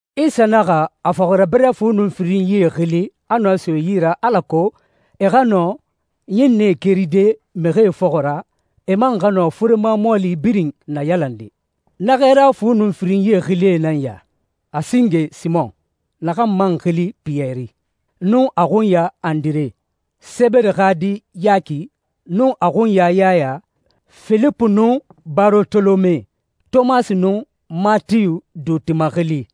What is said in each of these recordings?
Isa naxa a fɔxirabirɛ fu nun firinyie xili, a nɔɛ so e yi ra alako e xa nɔ ɲinnɛe keride mixie fɔxɔ ra, e man xa nɔ furema mɔɔli birin nayalande. Na xɛɛra fu nun firinyi xilie nan ya: a singe, Simɔn, naxan man xili Piyɛri, nun a xunya Andire, Sebede xa di Yaki, nun a xunya Yaya, Filipu nun Barotolome, Tomasi nun Matiyu duuti maxili,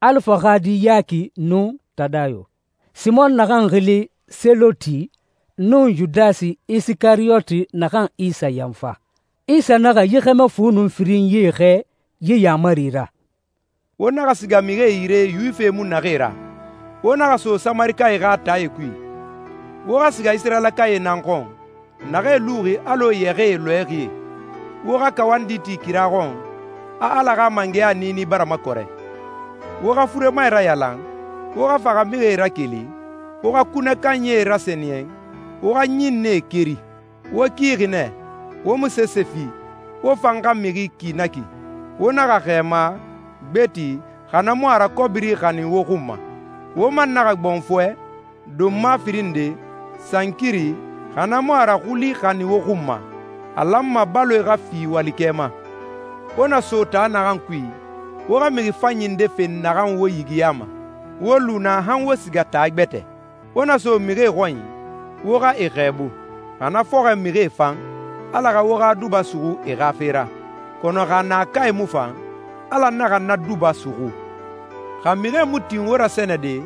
Alifa xa di Yaki nun Tadayo, Simɔn naxan xili Seloti, nun Yudasi Isikariyoti naxan Isa yanfa. Isa naxa yi xɛmɛ fu nun firinyie xɛɛ yi yaamari ra: «Wo naxa siga mixie yire Yuwifie mu naxee ra, wo naxa so Samarikae xa taae kui. Wo xa siga Isirayilakae nan xɔn, naxee luxi alɔ yɛxɛɛ lɔɛxie. Wo xa kawandi ti kira xɔn a Ala xa mangɛya niini bara makɔrɛ. Wo xa furemae rayalan, wo xa faxamixie rakeli, wo xa kunɛ kanyie rasɛniyɛn, wo xa ɲinnɛe keri. Wo kixi nɛ, wo mu sese fi. Wo fan xa mixi ki na ki. Wo naxa xɛɛma, gbeti, xa na mu a ra kɔbiri xanin wo xun ma. Wo man naxa gbɔnfɔɛ, donma firin nde, sankiri, xa na mu a ra xuli xanin wo xun ma. A lanma baloe xa fi walikɛ ma.» «Wo na so taa naxan kui, wo xa mixi fanyi nde fen naxan wo yigiyama, wo lu naa han wo siga taa gbɛtɛ. Wo na so mixie xɔnyi, wo xa e xɛɛbu. Xa na fɔxɔɛ mixie fan, Ala xa wo xa duba suxu e xa fe ra. Kɔnɔ xa naakae mu fan, Ala naxa na duba suxu. Xa mixie mu tin wo rasɛnɛde,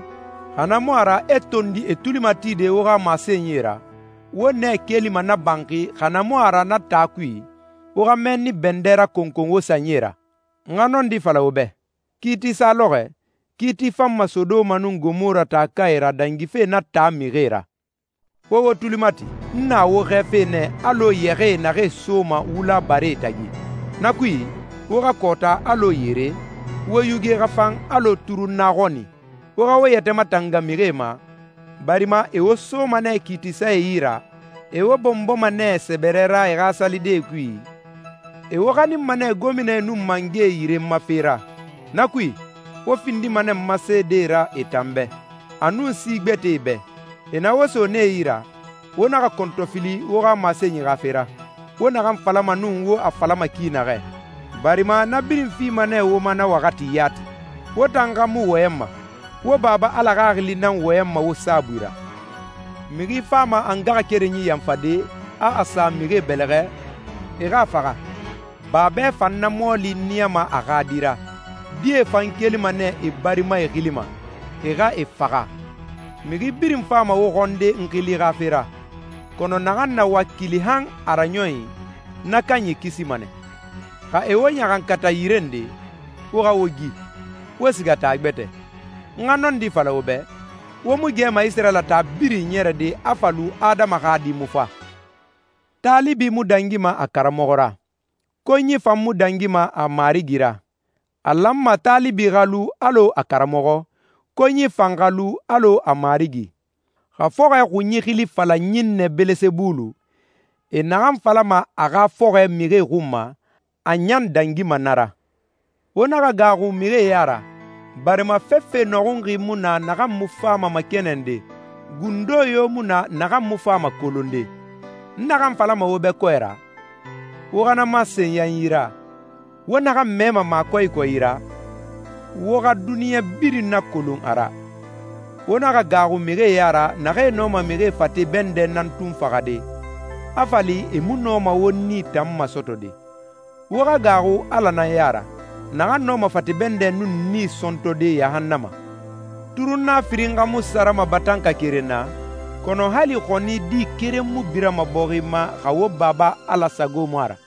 xa na mu a ra e tondi e tuli matide wo xa masenyi ra, wo nɛ kelima na banxi xa na mu a ra na taa kui, wo xa mɛnni bɛndɛ rakɔnkɔn wo sanyie ra. N xa nɔndi fala wo bɛ, kiiti sa lɔxɔɛ, kiiti fanma Sodoma nun Gomora taakae ra dangife na taa mixie ra.» «Wo wo tuli mati, n na wo xɛɛfe nɛ alɔ yɛxɛɛ naxee soma wula baree tagi. Na kui, wo xa kɔɔta alɔ yere, wo yuge xa fan alɔ turunna xɔni. Wo xa wo yɛtɛ matanga mixie ma, barima e wo soma nɛ kiitisae yi ra, e wo bɔnbɔma nɛ sɛbɛrɛ ra e xa salidee kui, e wo xaninma nɛ gominae nun mangɛe yire n ma fe ra. Na kui, wo findima nɛ n ma seedee ra e tan bɛ, a nun si gbɛtɛe bɛ. E na wo so nee yi ra, wo naxa kɔntɔfili wo xa masenyi xa fe ra, wo naxan falama nun wo a falama ki naxɛ, barima na birin fima nɛ wo ma na waxati yati. Wo tan xa mu wɔyɛnma, wo Baba Ala Xaxili nan wɔyɛnma wo saabui ra.» «Mixi fama a ngaxakerenyi yanfade, a a sa mixie bɛlɛxɛ, e xa a faxa. Babɛ fan na mɔɔli niyama a xa di ra, die fan kelima nɛ e barimae xili ma, e xa e faxa. Mixi birin fama wo xɔnde n xili xa fe ra, kɔnɔ naxan na wakili han a raɲɔnyi, na kanyi kisima nɛ. Xa e wo ɲaxankata yire nde, wo xa wo gi, wo siga taa gbɛtɛ. N xa nɔndi fala wo bɛ, wo mu gɛma Isirayila taa birin iɲɛrɛde a fa lu Adama xa Di mu fa.» «Taalibi mu dangima a karamɔxɔ ra, konyi fan mu dangima a marigi ra. A lanma taalibi xa lu alɔ a karamɔxɔ, konyi fan xa lu alɔ a marigi. Xa fɔxɔɛ xunyi xili fala ɲinnɛ Bɛlɛsɛbulu, e naxan falama a xa fɔxɔɛ mixie xun ma, a ɲan dangima na ra.» «Wo naxa gaaxu mixie ya ra, barima fefe nɔxunxi mu na naxan mu fama makɛnɛnde, gundo yo mu na naxan mu fama kolonde. N naxan falama wo bɛ kɔɛ ra, wo xa na masen yanyi ra. Wo naxan mɛma makɔyikɔyi ra, wo xa duniɲa birin nakolon a ra. Wo naxa gaaxu mixie ya ra naxee nɔma mixi fate bɛndɛ nan tun faxade, a fa li e mu nɔma wo nii tan masɔtɔde. Wo xa gaaxu Ala nan ya ra, naxan nɔma fate bɛndɛ nun nii sɔntɔde yahannama. Turunna firin xa mu sarama batanka keren na? Kɔnɔ hali xɔni di keren mu birama bɔxi ma xa wo Baba Ala sago mu a ra.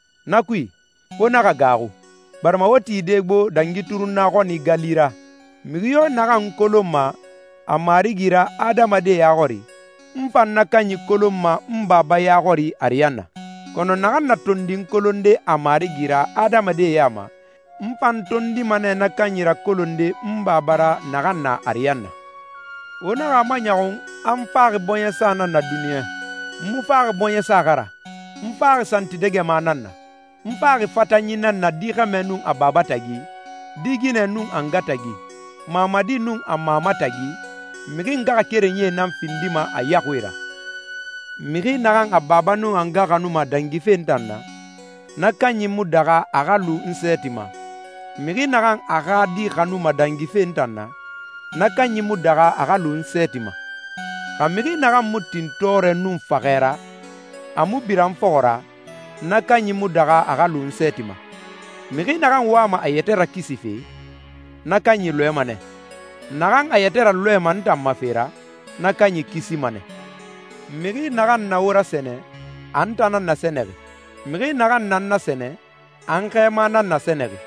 Na kui, wo naxa gaaxu, barima wo tide gbo dangi turunna xɔni gali ra.» «Mixi yo naxan n kolonma a Marigi ra adamadie ya xɔri, n fan na kanyi kolonma n Baba ya xɔri ariyanna. Kɔnɔ naxan na tondi n kolonde a Marigi ra adamadie ya ma, n fan tondima nɛ na kanyi rakolonde n Baba ra naxan na ariyanna.» «Wo naxa a maɲɔxun a n faxi bɔɲɛsa nan na duniɲa. N mu faxi bɔɲɛsa xa ra, n faxi santidɛgɛma nan na. N faxi fatanyi nan na di xɛmɛ nun a baba tagi, di ginɛ nun a nga tagi, mamadi nun a mama tagi. Mixi ngaxakerenyie nan findima a yaxuie ra. Mixi naxan a baba nun a nga xanuma dangife n tan na, na kanyi mu daxa a xa lu n sɛɛti ma. Mixi naxan a xa di xanuma dangife n tan na, na kanyi mu daxa a xa lu n sɛɛti ma. Xa mixi naxan mu tin tɔɔrɛ nun faxɛ ra, a mu bira n fɔxɔ ra, na kanyi mu daxa a xa lu n sɛɛti ma. Mixi naxan wama a yɛtɛ rakisife, na kanyi lɔɛma nɛ. Naxan a yɛtɛ ralɔɛma n tan ma fe ra, na kanyi kisima nɛ.» «Mixi naxan na wo rasɛnɛ, a n tan nan nasɛnɛxi. Mixi naxan na n nasɛnɛ, a n xɛɛma nan nasɛnɛxi.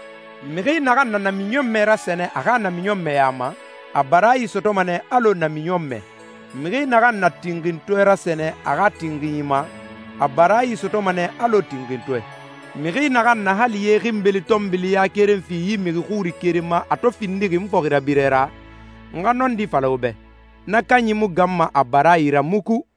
Mixi naxan na namiɲɔnmɛ rasɛnɛ a xa namiɲɔnmɛɲa ma, a baraayi sɔtɔma nɛ alɔ namiɲɔnmɛ. Mixi naxan na tinxintɔɛ rasɛnɛ a xa tinxinyi ma, a baraayi sɔtɔma nɛ alɔ tinxintɔɛ. Mixi naxan na hali ye xinbeli pɔɔti ya keren fi yi mixi xuri keren ma a to findixi n fɔxirabirɛ ra, n xa nɔndi fala wo bɛ, na kanyi mu ganma a baraayi ra muku.»